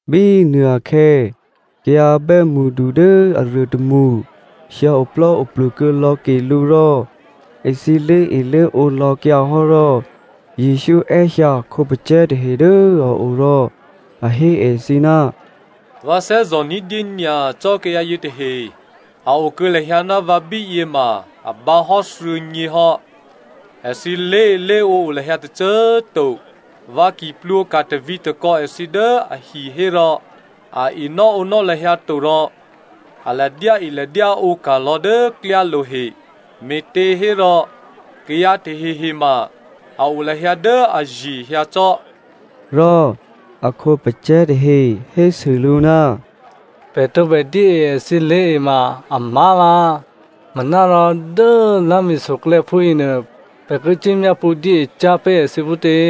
Bínuô akhè̌ kayǎ bè́mṳdu dố aruô tômṳ hyǎoplò́oplu kuô̌ lò̌ ke lǔ rò èthǐ lé̤elé̤ǒ lò̌kyǎ hò́ rò Jesǔ è́hyǎ a khǒpacè̤̌ tahe dố a o rò a hé èthǐ, “Vǎ thè́zò̤ ní̤dyé nyacò́ kayǎ yětahe, a o kuô̌ lahyǎ ná vǎ bíyě ma a bǎ hò́ thuô̌nyě hò́. Èthǐ lé̤elé̤ǒ o lahyǎ tôcô꤮ to. Vǎ ki plwǒka̤ tavǐ̤takò̌ èthǐ dố ahi hérò, a enò́ǒnò́ lahyǎ to rò a ladyáeladyáǒ ka̤ lò̌ dố klyálo̤ he, me̤těhérò kayǎ tahehe ma a o lahyǎ dố aye̤ hyǎ cò́.” Rò a khǒpacè̤̌ tahe hésû lǔ, “Pè̤ tǒbè dyée èthǐ lé̤e ma amá̤vǎ, manárò dố lá̤mi̤soklè̌ phúyěnuô, pè̤ ki cuốmyápṳ̌ dyée cyá̤ pé̤ èthǐ phútě?”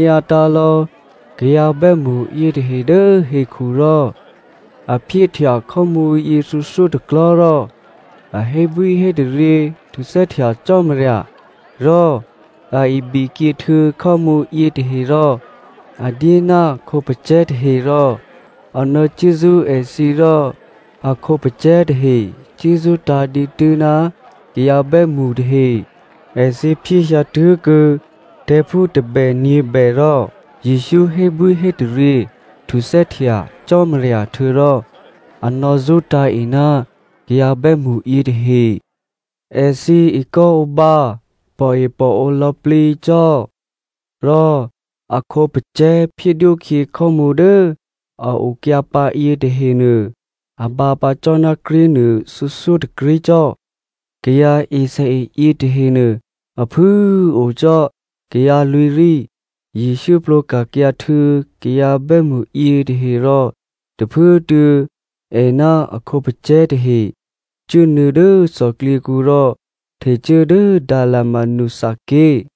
Jesǔ nò̌onyǎtǎ̤ lò̌ kayǎ bè́mṳ yětahe dố hekhu rò a phyéhtya khò́mǔ yěthuô̌thyótôklò̤́ rò a hébwíhétaryě htuthè́htya Cò́marya, rò a ibikyě htuô̌ khò́mǔ yětaherò a dyé ná a khǒpacè̤̌ tahe rò a nò̌cuốzṳ́ èthǐ rò a khǒpacè̤̌ tahe cuốzṳ́tǎ̤ dǐtû́ ná kayǎ bè́mṳ tahe. Èthǐ phyéhyǎ tuô̌kuô̌ tè̤̌phú tôbè nyě̤bè rò Jesǔ hébwíhétaryě htuthè́htya Cò́marya htuô̌rò a nò̌zṳ́tǎ̤ e ná kayǎ bè́mṳ yětahe. Èthǐ ekò́ǒbǎ pòepòǒ lò̌plǐ cò́. Rò a khǒpacè̤̌ phyédwókhyě khò́mǔ dố a okyǎpǎ yětahenuô a bǎpǎ cò́ ná krí̤nuô thuô̌thyótôkrí̤ cò́. Kayǎ esèe yětahenuô a phû꤮ o cò́ kayǎ lwǐ̤rí. Jesǔ plwǒka̤kyǎ htuô̌ kayǎ bè́mṳ yětahe rò tôphuốtuô̌ è ná a khǒpacè̤̌ tahe cuốnuô̌ dố thòklyěkǔ rò htecuố dố Dalmanutha ké̤.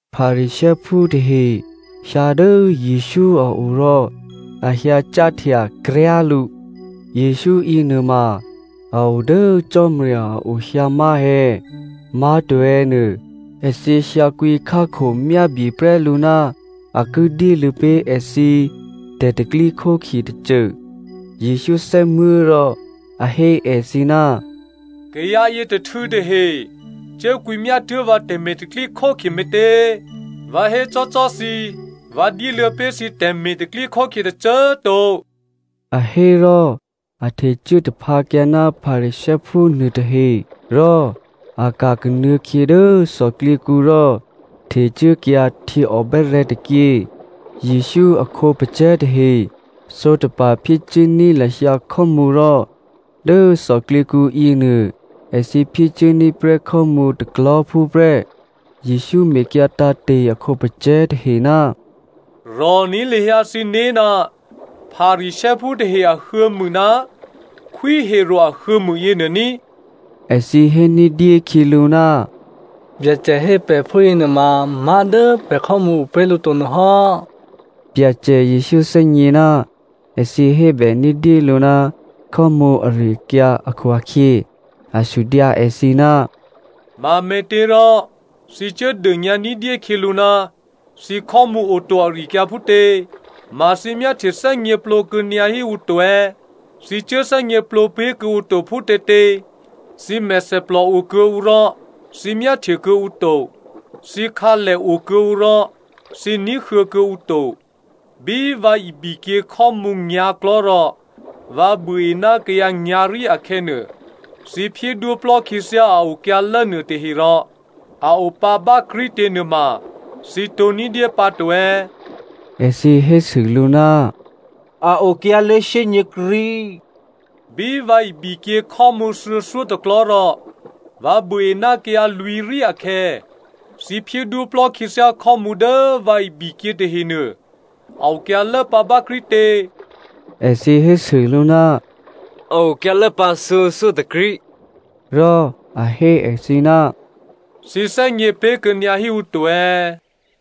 Pharisěophú tahe hyǎ dố Jesǔ a o rò a hyǎ cáhtya kryá̤ lǔ. Jesǔ yěnuôma a o dố Cò́marya a o hyǎ má̤ è̌, má̤to è̌ nuô, èthǐ hyǎkwǐ khákhomyábyeprè́ lǔ ná a ki dyéluô̌ pé̤ èthǐ tè̤pro̤tè̤prya̤ tôcô. Jesǔ thè́muố̤ rò a hé èthǐ, “Kayǎ yětôhtû̌ tahe cuốkwǐmyá tuố̤ vǎ tè̤me̤ tè̤pro̤tè̤prya̤ me̤tě? Vǎ hécò́cò́ thǐ vǎ dyéluô̌ pé̤ thǐ tè̤me̤ tè̤pro̤tè̤prya̤ tôcô꤮ to.” A hé rò a htecuố taphǎkyǎ ná Pharisěophú nuôtahe, rò a ka̤ kanuô̌khyě dố thòklyěkǔ rò htecuốkyǎ htyěòbè́rè̤̌ tôkyě. Jesǔ a khǒpacè̤̌ tahe sǒtapa̤ phyécuốní̤ lahyǎ khò́mǔ rò dố thòklyěkǔ yěnuô èthǐ phyécuốní̤ prè́ khò́mǔ tôklò̤́phú prè́. Jesǔ mekyǎ tǎ̤te̤ a khǒpacè̤̌ tahe, “Rò̤ní̤ lahyǎ thǐné̤ ná Pharisěophú tahe ahuô̌mû ná Khwí Herodè ahuô̌mû yěnuô ní꤮.” Èthǐ hé ní̤dyé khyělǔ, “Byacè hé pè̤ phúyěnuôma, má̤ dố pè̤ khò́mǔ o pé̤ lǔ to nuôhò́.” Byacè Jesǔ thè́gně ná èthǐ hébè ní̤dyélǔ ná khò́mǔ ari-akyǎ akhu-akhyě, a sudyǎ èthǐ, “Mame̤těrò thǐ cuốdônyǎ ní̤dyé khyělǔ ná thǐ khò́mǔ oto ari-akyǎ phútě? Ma thǐ myáhtye thè́gněplǒ kuô̌nyǎ híǔ to è̌? Thǐ cuốthè́gněplǒ pé̤ kuô̌ǔ to phútětě? Thǐ mèthèplò o kuô̌ǔ rò thǐ myáhtye kuô̌ǔ to, thǐkhǎlè o kuô̌ǔ rò thǐ ní̤huô̌ kuô̌ǔ to. Bí vǎ ibikyě khò́mǔ nyǎ̤klò̤́ rò vǎ buôe ná kayǎ nyǎ̤rí akhè̌nuô, thǐ phyédwóplò́ khyěthyá a okyǎlố nuôtaherò a opǎ bákrí̤tě nuôma thǐ tǒ̤ní̤dyé pǎto è̌?” Èthǐ hésû lǔ, “A okyǎlố shyényě̤krí̤.” “Bí vǎ ibikyě khò́mǔ thuô̌thyótôklò̤́ rò vǎ buôe ná kayǎ lwǐ̤rí akhè̌, thǐ phyédwóplò́ khyěthyá khò́mǔ dố vǎ ibikyě tahenuô, a okyǎlố pǎ bákrí̤tě?” Èthǐ hésû lǔ, “A okyǎlố pǎ thuô̌thyó tôkrí̤.” Rò a hé èthǐ, “Thǐ thè́gně pé̤kuô̌nyǎ híǔ to è̌?”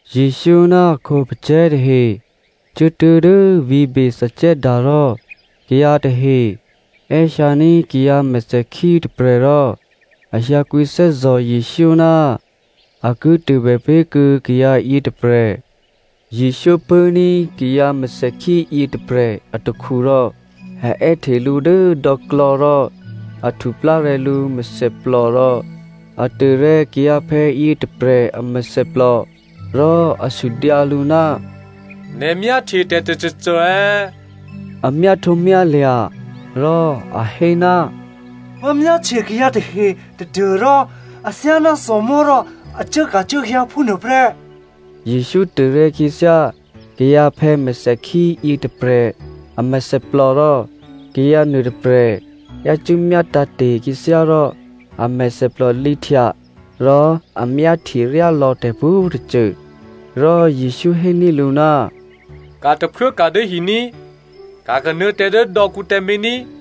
Jesǔ ná a khǒpacè̤̌ tahe cuốtuố̤ dố vǐ̤ Bethsaida rò kayǎ tahe è́hyǎní̤ kayǎ mèthèkhí tôprè̤ rò a hyǎkwǐthè́zò̤ Jesǔ ná a ki tôbè pé̤ kuô̌ kayǎ yětôprè̤. Jesǔ pṳ̂́ní̤ kayǎ mèthèkhí yětôprè̤ atakhu rò a è́hte lǔ dố dò̌klò̌ rò a htuplárè̤̌ lǔ mèthèplò rò a tôrè̤̌ kayǎphè̌ yětôprè̤ a mèthèplò rò a sudyǎ lǔ, “Nè̤ myáhtye tè̤ tôcôcô è̌?” A myáhtǒmyálya̤ rò a hé, “Vǎ myáhtye kayǎ tahe tadû́rò athyáná thòmò̤́ rò a cuốka̤cuốhyǎ phúnuô prè́.” Jesǔ tôrè̤̌ khyěthyá kayǎphè̌ mèthèkhí yětôprè̤ a mèthèplò rò kayǎ nuôtôprè̤ yácû́ myátǎ̤te̤ khyěthyá rò a mèthèplò lǐhtya rò a myáhtye ryálò̌ tè̤pwǒ̤tôcô. Rò Jesǔ héní̤ lǔ, “Ka̤ tôphuốka̤ dố hi ní꤮, ka̤ kanuô̌ tǎ dố dò̌kǔ tǎmé̤ ní꤮.”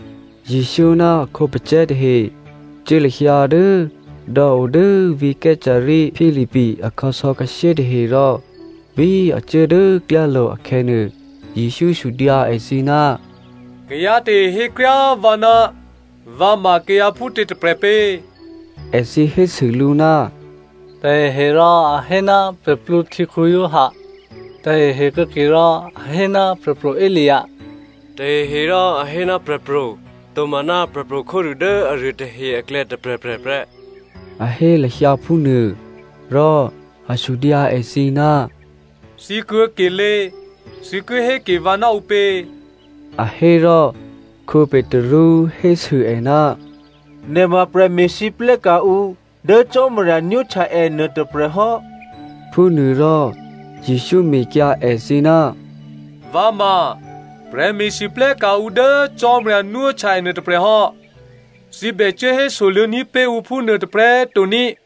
Jesǔ ná a khǒpacè̤̌ tahe cuố lahyǎ dố dò̌ o dố vǐ̤ Caesarea Philipi akhǎsò̌khǎshyé tahe rò bí a cuố dố klyálo̤ akhè̌nuô, Jesǔ sudyǎ èthǐ, “Kayǎ tahe hékryá꤮ vǎ ná vǎ ma kayǎ phútě tôprè̤ pě?” Èthǐ hésû lǔ, “Taheherò a hé ná Giovanni Baptista, tahehe kuô̌kerò a hé ná Prè̤pro̤ Elia, taheherò a hé ná prè̤pro̤ tomaná prè̤pro̤ khódû dố aruô tahe aklè̌ tôprè̤prè̤ prè́,” a hé lahyǎ phúnuô. Rò a sudyǎ èthǐ, “Thǐ kuô̌kelé꤮, thǐ ki hé ke vǎ ná ǔpě?” A hé rò Petru hésû è, “Nè̤ ma prè̤me̤lwóhteka̤ ǔ dố Cò́marya nwóhtya è nuôtôprè̤ hò́.” Phúnuôrò Jesǔ mekyǎ èthǐ, “Vǎ ma prè̤me̤lwóhteka̤ ǔ dố Cò́marya nwóhtya è nuôtôprè̤ hò́, thǐ bè cuố hésoluô̌ní̤ pé̤ ǔ phúnuô tôprè̤꤮ to ní꤮.”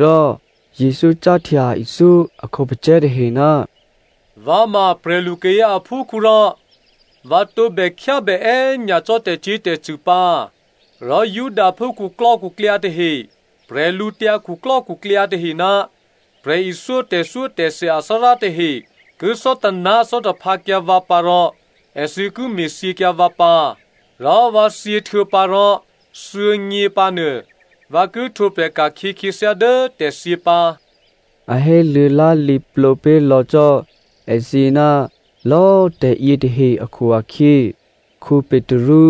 Rò Jesǔ cáhtya ithyó a khǒpacè̤̌ tahe, “Vǎ ma prè̤lu kayǎ aphúkhǔ rò vǎ tǒbè khyábè è́nyacò́ tè̤cyě̤tè̤cṳ̂ pǎ, rò Judaphú khuklò́khuklyǎ tahe, bwídukhu tahe ná prè̤ithyó tè̤thyótè̤thya athárá tahe ki thò́taná̤ thò́taphǎkyǎ vǎ pǎ rò èthǐ ki me̤thyěkyǎ vǎ pǎ. Rò vǎ thyěhtuô̌pǎ rò thuô̌nyě pǎnuô, vǎ ki htwǒprè̤ ka̤khyě khyěthyá dố tè̤thyě pǎ.” A héluô̌ lá̤lǐ plǒ pé̤lò̌ cò́ èthǐ ná lò̌꤮ tè̤yětahe akhu-akhyě Petru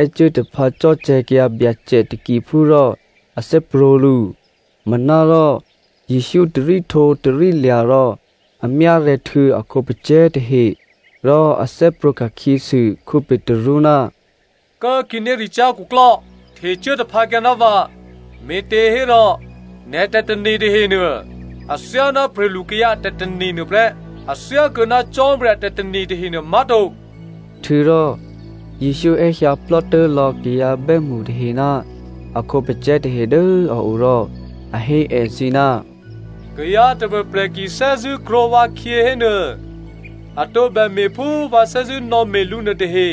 è́cuố taphǎ cò̤́cè̤̌kyǎ Byacè takiphú rò a thè́prwǒ̤ lǔ. Manárò Jesǔ taríhtǒtarílya̤ rò a myárè̤̌ htuô̌ a khǒpacè̤̌ tahe rò a thè́prwǒ̤ ka̤khyěsû Petru, “Kố꤮ khǐnéricyá̤ khuklò́, htecuố taphǎkyǎ ná vǎ, me̤těhérò nè̤ tè̤tane̤ tahenuô athyáná prè̤lukayǎ a tè̤tane̤ nuô prè́, a thyákuô̌ ná Cò́marya a tè̤tane̤ tahenuô má̤to.” Htuô̌rò Jesǔ è́hyǎplò́tố̤ lò̌ kayǎ bè́mṳ tahe ná a khǒpacè̤̌ tahe dố a o rò a hé èthǐ, “Kayǎ tôprè̤prè̤ ki thè́zṳ̂́ krwǒ vǎkhyě hénuô, a tǒbè me̤ phú vǎ thè́zṳ̂́nò̌me̤ lǔ nuôtahe,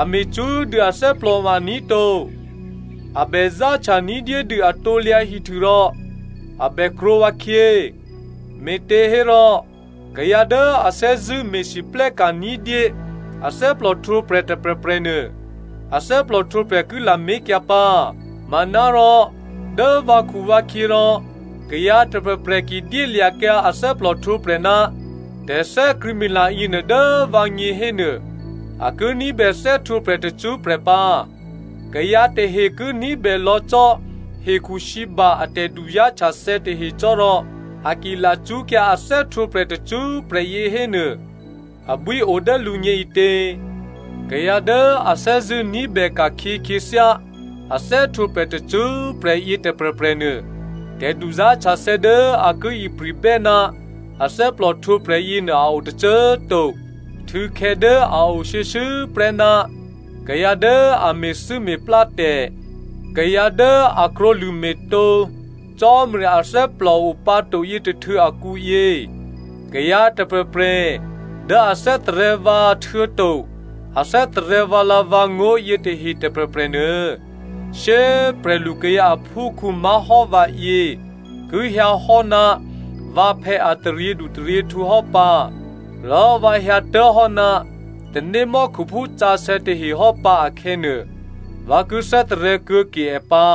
a me̤ cṳ́꤮ dû athè́plò ma aní̤ to. A bè záhtya ní̤dyédû a krusu rò a bè krwǒ vǎkhyě. Me̤těhérò kayǎ dố a thè́zṳ̂́ me̤lwóhteka̤ ní̤dyé a thè́plòhtwǒprè̤ tôprè̤prè̤ nuô, a thè́plòhtwǒprè̤ ki lamé̤kyǎ pǎ. Manárò dố vǎkhuvǎkhyě rò kayǎ tôprè̤prè̤ ki dyélya̤kyǎ a thè́plòhtwǒprè̤ ná tè̤thè́krṳ̂̌mila yěnuô dố vǎgně hénuô, a ki ní̤bè thè́htwǒprè̤ tacṳ́prè̤ pǎ. Kayǎ tahe ki ní̤bè lò̌ cò́ hekhusǐba a tè̤duzá̤htyathè̌ tahe cò́ rò a ki lacṳ́kyǎ a thè́htwǒprè̤ tacṳ́prè̤ yě hénuô abwío dố lǔgně ǐtě? Kayǎ dố a thè́zṳ̂́ ní̤bè ka̤khyě khyěthyá a thè́htwǒprè̤ tacṳ́prè̤ yě tôprè̤prè̤nuô tè̤duzá̤htyathè̌ dố a ki ipri̤bè́ ná a thè́plòhtwǒprè̤ yěnuô a o tôcô꤮ to. Htû̌khè̌ dố a o shuô̌shuô̌prè́ ná kayǎ dố a me̤thû́me̤plátè̤, kayǎ dố a krwǒlṳ̂me̤ tǒ Cò́marya athè́plò o pǎ to yětôhtû̌ akǔyě, kayǎ tôprè̤prè̤ dố a thè́tarè̤̌ vǎ htuô̌to a thè́tarè̤̌ vǎlǎ̤vǎngó̤ yětahe tôprè̤prè̤ nuô, shyé꤮ prè̤lukayǎ aphúkhǔ má̤hò́ vǎyě ki hyǎhò́ ná vǎphè̌ a taryědutaryěhtǔ hò́pǎ, rò vǎ hyǎtố̤hò́ ná tanémò́khuphú sǎsè̌ tahe hò́pǎ akhè̌nuô, vǎ ki thè́tarè̤̌ kuô̌ke è pǎ.”